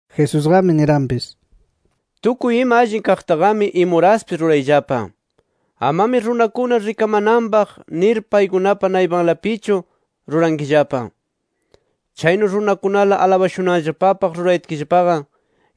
Jesusqami niranpis: “Tukuy ima allin kaqtaqami imuraspis rurayllapa. Amami runakuna rikamananpaq nir paykunapa naypanlapichu rurankillapa. Chaynu runakunala alabashunanllapapaq rurayatkillapaqa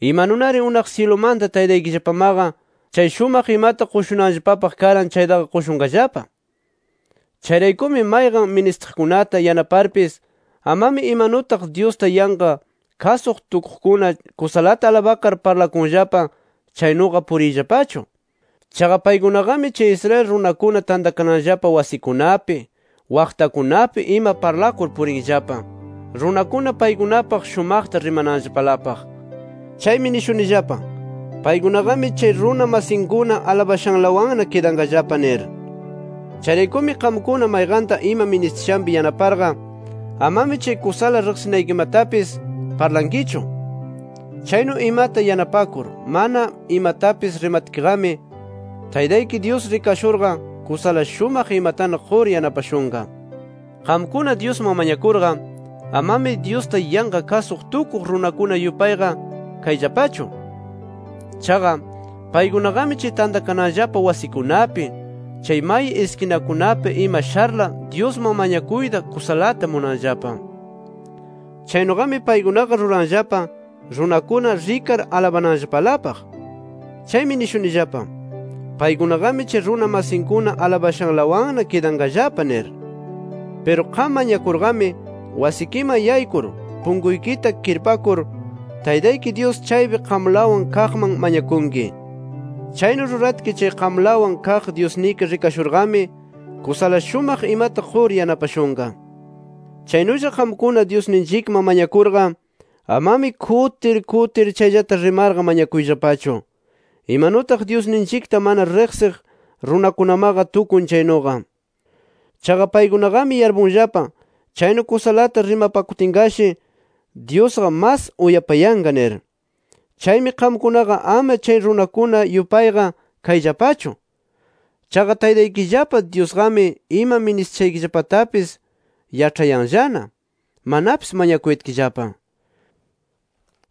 imanunari unaq syilumanta Taytaykillapamaqa chay shumaq imata qushunanllapapaq karan chaytaqa qushunqallapa. “Chayraykumi mayqan ministiqkunata yanaparpis amami imanutaq Dyusta yanqa kasuq tukuqkuna kusalata alabakar parlakunllapa chaynuqa puriyllapachu. Chaqa paykunaqami chay Israel runakuna tantakananllapa wasikunapi, waqtakunapi ima parlakur purinllapa, runakuna paykunapaq shumaqta rimananllapalapaq. Chaymi nishunillapa: Paykunaqami chay runa masinkuna alabashanlawanna kidanqallapa nir. Chayraykumi qamkuna mayqanta ima ministishanpi yanaparqa amami chay kusala riqsinaykimatapis parlankichu. Chaynu imata yanapakur mana imatapis rimatkiqami, Taytayki Dyus rikashurqa kusala shumaq imatana qur yanapashunqa. “Qamkuna Dyusman mañakurqa, amami Dyusta yanqa kasuq tukuq runakuna yupayqa kayllapachu. Chaqa, paykunaqami chay tantakananllapa wasikunapi, chay may iskinakunapi ima sharla Dyusman mañakuyta kusalata munanllapa. Chaynuqami paykunaqa ruranllapa runakuna rikar alabananllapalapaq. Chaymi nishunillapa: Paykunaqami chay runa masinkuna alabashanlawanna kidanqallapa nir. Piru qam mañakurqami wasikiman yaykur, punkuykita kirpakur Taytayki Dyus chaypi qamlawan kaqman mañakunki. Chaynu ruratki chay qamlawan kaq Dyusniki rikashurqami kusala shumaq imata qur yanapashunqa. “Chaynulla qamkuna Dyusninchikman mañakurqa amami kutir kutir chayllata rimarqa mañakuyllapachu, imanutaq Dyusninchikta mana riqsiq runakunamaqa tukun chaynuqa. Chaqa paykunaqami yarpunllapa chaynu kusalata rimapakutinqashi Dyusqa mas uyapayanqa nir. Chaymi qamkunaqa ama chay runakuna yupayqa kayllapachu. Chaqa Taytaykillapa Dyusqami ima ministiyashaykillapatapis yaĉhayanllana manapis mañakuyatkillapa.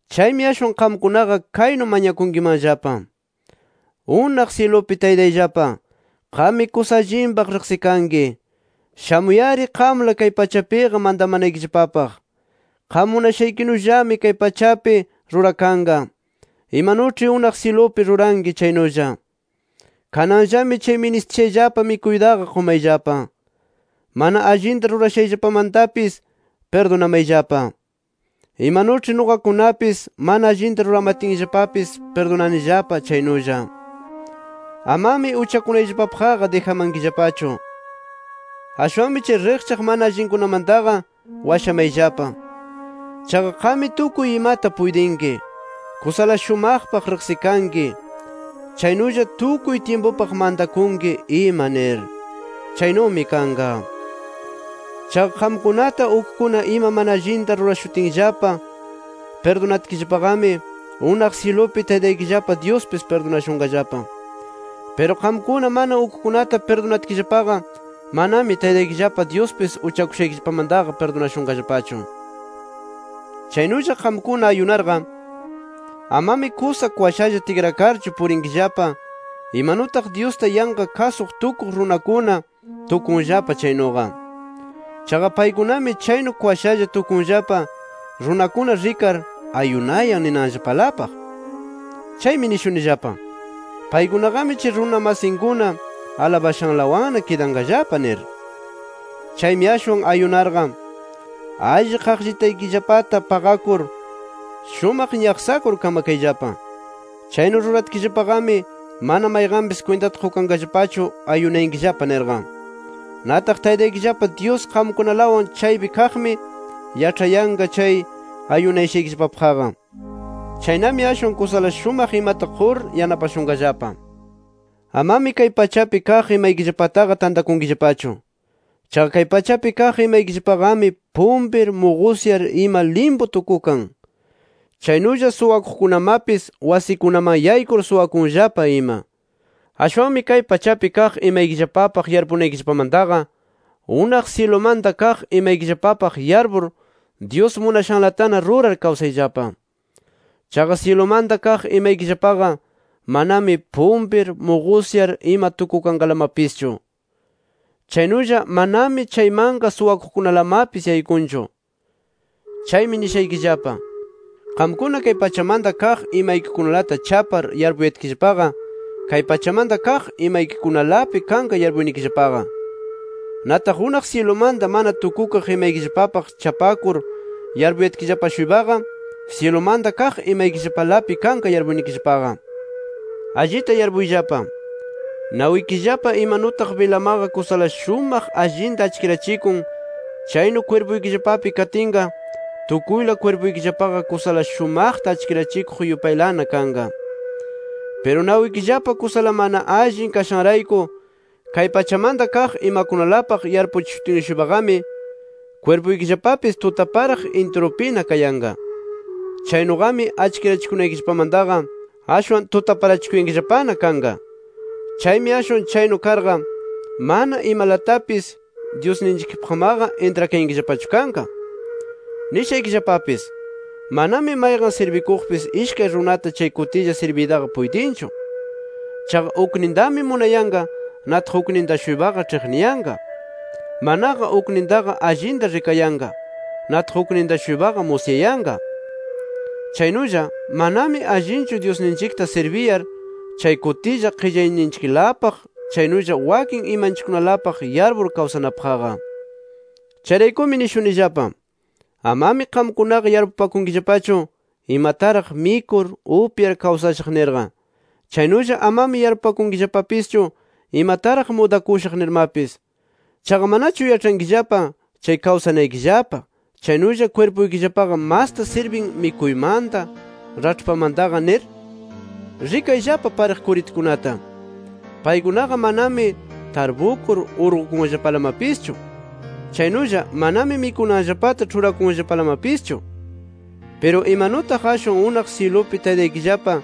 Chaymi ashwan qamkunaqa kaynu mañakunkimanllapa: Unaq syilupi Taytayllapa, qammi kusa allinpaq riqsikanki. Shamuy-ari qamla kay pachapiqa mantamanaykillapapaq. Qam munashaykinullami kay pachapi rurakanqa imanuĉhi unaq syilupi ruranki chaynulla. Kananllami chay ministiyashayllapa mikuytaqa qumayllapa. Mana allinta rurashayllapamantapis pirdunamayllapa, imanuĉhi nuqakunapis mana allinta ruramatinllapapis pirdunanillapa chaynulla. Amami uchakunayllapapaqqa dijamankillapachu. Ashwanmi chay riqchaq mana allinkunamantaqa washamayllapa. [Chaqa qammi tukuy imata puytinki; kusala shumaqpaq riqsikanki; chaynulla tukuy tyimpupaq mantakunki ima nir. ¡Chaynumi kanqa!] “Chaqa qamkunata ukkuna ima mana allinta rurashutinllapa pirdunatkillapaqami, unaq syilupi Taytaykillapa Dyuspis pirdunashunqallapa. Piru qamkuna mana ukkunata pirdunatkillapaqa manami Taytaykillapa Dyuspis uchakushaykillapamantaqa pirdunashunqallapachu. “Chaynulla qamkuna ayunarqa, amami kusa kwashalla tikrakarchu purinkillapa imanutaq Dyusta yanqa kasuq tukuq runakuna, tukunllapa chaynuqa. Chaqa paykunami chaynu kwashalla tukunllapa runakuna rikar, ayunayan ninanllapalapaq. Chaymi nishunillapa: Paykunaqami chay runa masinkuna alabashanlawanna kidanqallapa nir. Chaymi ashwan ayunarqa, alli qaqllitaykillapata paqakur, shumaq ñaqsakur kamakayllapa. Chaynu ruratkillapaqami mana mayqanpis kwintata qukanqallapachu ayunayankillapa nirqa. Nataq Taytaykillapa Dyus qamkunalawan chaypi kaqmi, yaĉhayanqa chay ayunayashaykillapapaqqa. Chaynami ashwan kusala shumaq imata qur yanapashunqallapa. “Amami kay pachapi kaq imaykillapataqa tantakunkillapachu. Chaqa kay pachapi kaq imaykillapaqami pumpir, muqusyar ima, limpu tukukan. Chaynulla suwakuqkunamapis wasikunaman yaykur suwakunllapa ima. Ashwanmi kay pachapi kaq imaykillapapaq yarpunaykillapamantaqa unaq syilumanta kaq imaykillapapaq yarpur Dyus munashanlatana rurar kawsayllapa. Chaqa syilumanta kaq imaykillapaqa manami pumpir, muqusyar ima tukukanlamapischu. Chaynulla manami chaymanqa suwakuqkunalamapis yaykunchu. Chaymi nishaykillapa: Qamkuna kay pachamanta kaq imaykikunalata chapar yarpuyatkillapaqa kay pachamanta kaq imakunalapi kanqa yarpuynikillapaqa. Nataq unaq syilumanta mana tukukaq imaykillapapaq chapakur yarpuyatkillapa-shuypaqa syilumanta kaq imaykillapalapi kanqa yarpuynikillapaqa. “Allita yarpuyllapa: Nawikillapa imanutaq bilamaqa kusala shumaq allinta achkirachikun chaynu kwirpuykillapapi katinqa, tukuyla kwirpuykillapaqa kusala shumaqta achkirachikuq yupaylana kanqa. Piru nawikillapa kusala mana allin kashanrayku kay pachamanta kaq imakunalapaq yarpuchishutin-shuypaqami kwirpuykillapapis tutaparaq intirupina kayanqa. Chaynuqami achkirachikunaykillapamantaqa ashwan tutaparachikuyankillapana kanqa. Chaymi ashwan chaynu karqa mana imalatapis Dyusninchikpaqmaqa intrakayankillapachu kanqa. “Nishaykillapapis: Manami mayqan sirbikuqpis ishkay runata chay kutilla sirbiytaqa puytinchu. Chaqa uknintami munayanqa, nataq ukninta-shuypaqa ĉhiqniyanqa. Manaqa uknintaqa allinta rikayanqa, nataq ukninta-shuypaqa musyayanqa. Chaynulla manami allinchu Dyusninchikta sirbiyar chay kutilla qillayninchiklapaq chaynulla wakin imanchikkunalapaq yarpur kawsanapaqqa. “Chayraykumi nishunillapa: Amami qamkunaqa yarpupakunkillapachu, imataraq mikur, upyar kawsashaq nirqa. Chaynulla amami yarpupakunkillapapischu imataraq mudakushaq nirmapis. ¿Chaqa manachu yaĉhankillapa chay kawsanaykillapa, chaynulla kwirpuykillapaqa masta sirbin mikuymanta, raĉhpamantaqa nir? Rikayllapa pariq kuritukunata. Paykunaqa manami tarpukur urqukunllapalamapischu. Chaynulla manami mikunanllapata ĉhurakunllapalamapischu. Piru, imanutaq ashwan unaq syilupi Taytaykillapa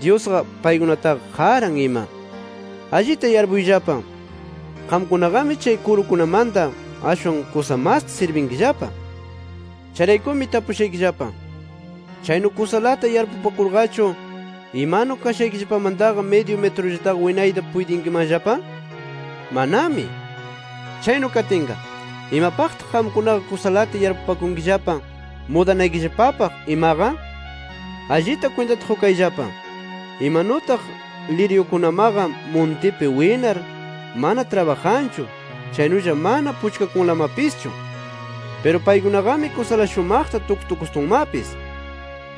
Dyusqa paykunataqa qaran ima. ¡Allita yarpuyllapa, qamkunaqami chay kurukunamanta ashwan kusa masta sirbinkillapa! Chayraykumi tapushaykillapa: ¿Chaynu kusalata yarpupakurqachu, imanu kashaykillapamantaqa midyu mitrullataqa winayta puytinkimanllapa? ¡Manami! “Chaynu katinqa, ¿imapaqtaq qamkunaqa kusalata yarpupakunkillapa mudanaykillapapaq imaqa? Allita kwintata qukayllapa, imanutaq liryukunamaqa muntipi winar, mana trabajanchu chaynulla mana puchkakunlamapischu. “Piru paykunaqami kusala shumaqta tuktukustunmapis.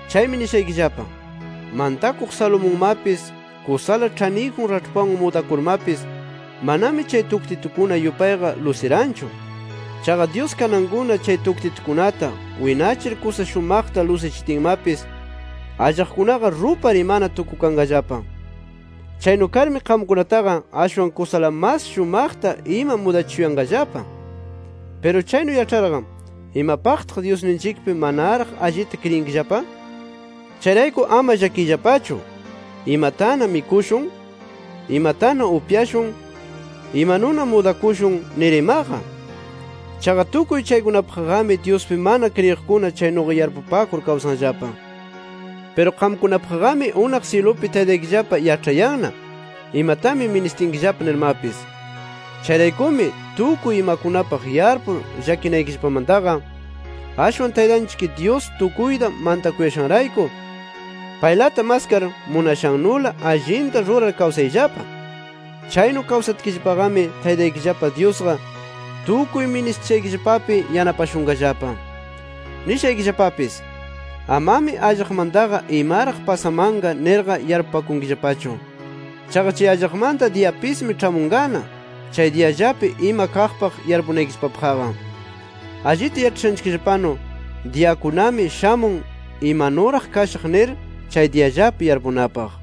Chaymi nishaykillapa: Mantakuq Salomonmapis kusala ĉhaniyjun raĉhpanwan mudakurmapis manami chay tuktitukuna yupayqa lusiranchu. Chaqa Dyus kanankuna chay tuktitukunata winachir kusa shumaqta lusichitinmapis, allaqkunaqa rupar imana tukukanqallapa. Chaynu karmi qamkunataqa ashwan kusala mas shumaqta ima mudachishuyanqallapa. Piru chaynu yaĉharqa, ¿imapaqtaq Dyusninchikpi manaraq allita kriyinkillapa? Chayrayku ama llakiyllapachu ‘¿Imatana mikushun? ¿Imatana upyashun? ¿Imanuna mudakushun?’ nir imaqa. Chaqa tukuy chaykunapaqqami Dyuspi mana kriyiqkuna chaynuqa yarpupakur kawsanllapa. Piru qamkunapaqqami unaq syilupi Taytaykillapa yaĉhayanna, imatami ministinkillapa nirmapis. Chayraykumi, tukuy imakunapaq yarpur llakinaykillapamantaqa, ashwan Taytanchikllapa Dyus tukuyta mantakushanrayku, paylata maskar munashannula allinta rurar kawsayllapa. Chaynu kawsatkillapaqami Taytaykillapa Dyusqa tukuy ministishaykillapapi yanapashunqallapa. Nishaykillapapis: Amami allaqmantaqa imaraq pasamanqa nirqa yarpupakunkillapachu. Chaqa chay allaqmanta diyapismi ĉhamunqana chay diyallapi ima kaqpaq yarpunaykillapapaqqa. Allita yaĉhashanchikllapanu, diyakunami shamun imanuraq kashaq nir chay diyallapi yarpunapaq.